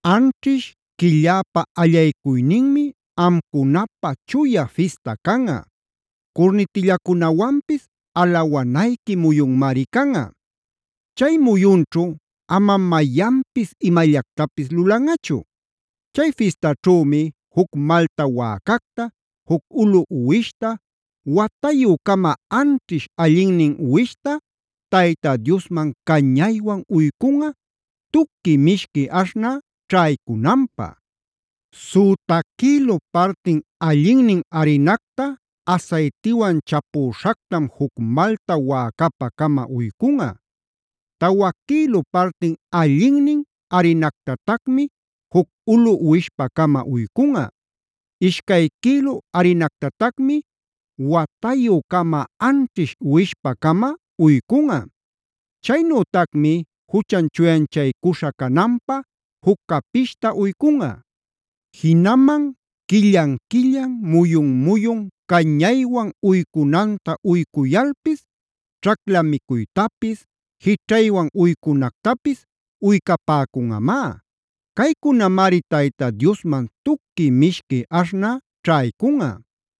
“Anćhish quilläpa allaycuyninmi amcunapä chuya fista canꞌa; curnitillacunawanpis alawanayqui muyunmari canꞌa. Chay muyunćhu amam mayanpis imallactapis lulanꞌachu. Chay fistaćhümi juc malta wäcacta, juc ulu uwishta, watayü-cama anćhish allinnin uwishta Tayta Diosman cañaywan uycunꞌa, tuqui mishqui aśhnä ćhaycunanpä. Süta quïlu partin allinnin arinacta asaytiwan chapüśhactam juc malta wäcapä-cama uycunꞌa. Tawa quïlu partin allinnin arinactatacmi juc ulu uwishpä-cama uycunꞌa. Ishcay quïlu arinactatacmi watayü-cama anćhish uwishpä-cama uycunꞌa. Chaynütacmi juchan chuyanchaycuśha cananpä juc capishta uycunꞌa. Jinaman quillan-quillan, muyun-muyun cañaywan uycunanta uycuyalpis, ćhacla micuytapis, jićhaywan uycunactapis uycapäcunꞌamá. Caycunamari Tayta Diosman tuqui mishqui aśhnä ćhaycunꞌa.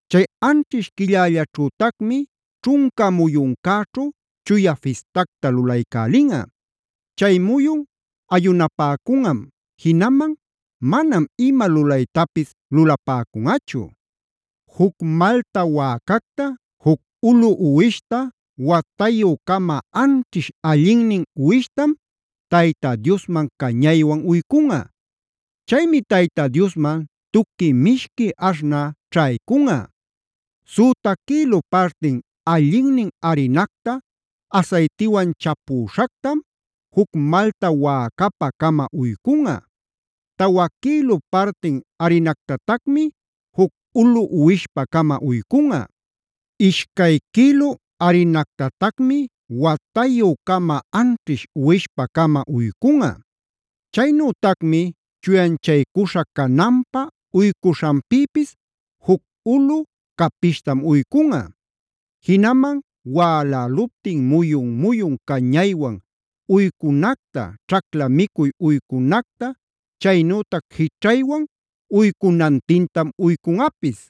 “Chay anćhish quillällaćhütacmi ćhunca muyuncäćhu chuya fistacta lulaycälinꞌa. Chay muyun ayunapäcunꞌam;a jinaman manam ima lulaytapis lulapäcunꞌachu. Juc malta wäcacta, juc ulu uwishta, watayü-cama anćhish allinnin uwishtam Tayta Diosman cañaywan uycunꞌa. Chaymi Tayta Diosman tuqui mishqui aśhnä ćhaycunꞌa. Süta quïlu partin allinnin arinacta asaytiwan chapüśhactam juc malta wäcapä-cama uycunꞌa. Tawa quïlu partin arinactatacmi juc ulu uwishpä-cama uycunꞌa. Ishcay quïlu arinactatacmi watayü-cama anćhish uwishpä-cama uycunꞌa. Chaynütacmi chuyanchaycuśha cananpä uycuśhanpïpis juc ulu capishtam uycunꞌa. Jinaman wäläluptin muyun-muyun cañaywan uycunacta, ćhacla micuy uycunacta, chaynütac jićhaywan uycunantintam uycunꞌapis.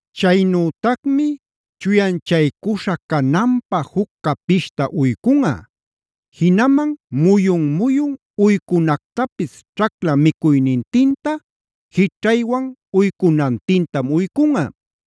Chaynütacmi chuyanchaycuśha cananpä juc capishta uycunꞌa; jinaman muyun-muyun uycunactapis ćhacla micuynintinta, jićhaywan uycunantintam uycunꞌa.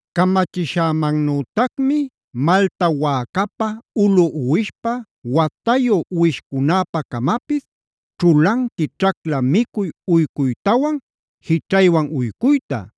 Camachishämannütacmi malta wäcapä, ulu uwishpä, watayu uwishcunäpä-camapis ćhulanqui ćhacla micuy uycuytawan jićhaywan uycuyta.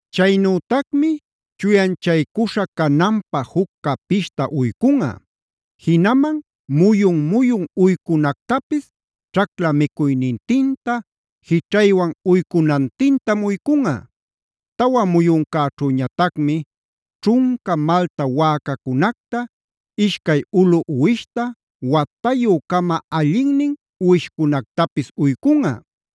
Chaynütacmi chuyanchaycuśha cananpä juc capishta uycunꞌa; jinaman muyun-muyun uycunactapis ćhacla micuynintinta, jićhaywan uycunantintam uycunꞌa. “Tawa muyuncäćhüñatacmi ćhunca malta wäcacunacta, ishcay ulu uwishta, watayü-cama allinnin uwishcunactapis uycunꞌa.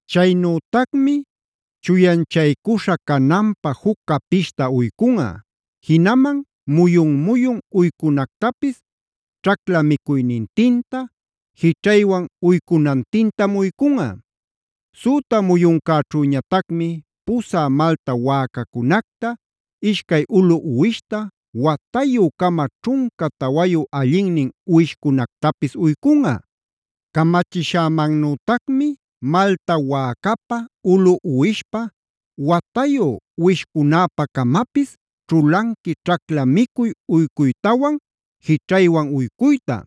Chaynütacmi chuyanchaycuśha cananpä juc capishta uycunꞌa; jinaman muyun-muyun uycunactapis ćhacla micuynintinta, jićhaywan uycunantintam uycunꞌa. “Süta muyuncäćhüñatacmi pusä malta wäcacunacta, ishcay ulu uwishta, watayü-cama ćhunca tawayu allinnin uwishcunactapis uycunꞌa. Camachishämannütacmi malta wäcapä, ulu uwishpä, watayu uwishcunäpä-camapis ćhulanqui ćhacla micuy uycuytawan jićhaywan uycuyta.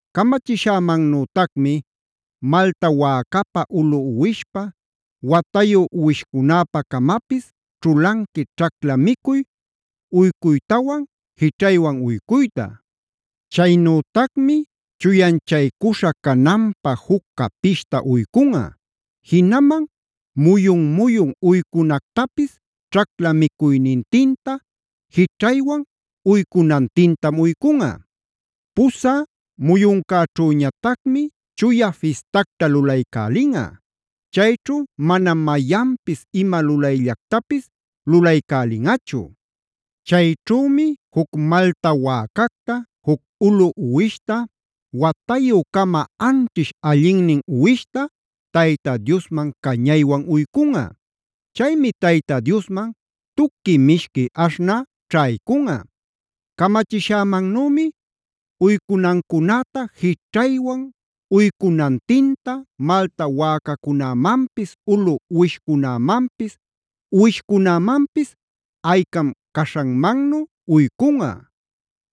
Camachishämannütacmi malta wäcapä, ulu uwishpä, watayu uwishcunäpä-camapis ćhulanqui ćhacla micuy uycuytawan jićhaywan uycuyta. Chaynütacmi chuyanchaycuśha cananpä juc capishta uycunꞌa; jinaman muyun-muyun uycunactapis ćhacla micuynintinta, jićhaywan uycunantintam uycunꞌa. “Pusä muyuncäćhüñatacmic chuya fistacta lulaycälinꞌa. Chayćhu manam mayanpis ima lulayllactapis lulaycälinꞌachu. Chayćhümi juc malta wäcacta, juc ulu uwishta, watayü-cama anćhish allinnin uwishta Tayta Diosman cañaywan uycunꞌa. Chaymi Tayta Diosman tuqui mishqui aśhnä ćhaycunꞌa. Camachishämannümi uycunancunäta, jićhaywan uycunantinta malta wäcacunämanpis, ulu uwishcunämanpis, uwishcunämanpis aycam caśhanmannu uycunꞌa.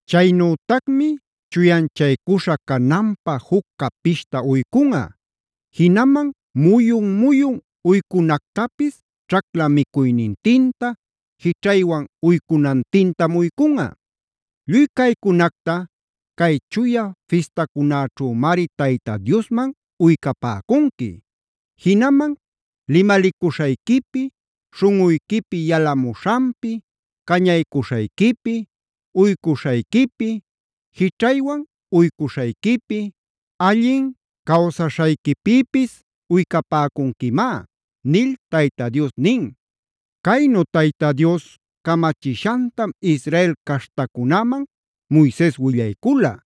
Chaynütacmi chuyanchaycuśha cananpä juc capishta uycunꞌa; jinaman muyun-muyun uycunactapis ćhacla micuynintinta, jićhaywan uycunantintam uycunꞌa. “Lluy caycunacta cay chuya fistacunäćhümari Tayta Diosman uycapäcunqui. Jinaman limalicuśhayquipi, śhunꞌuyquipi yalamuśhanpi, cañaycuśhayquipi, uycuśhayquipi, jićhaywan uycuśhayquipi, allin cawsaśhanpïpis uycapäcunquimá” nil Tayta Dios nin. Caynu Tayta Dios camachishantam Israel caśhtacunäman Moises willaycula.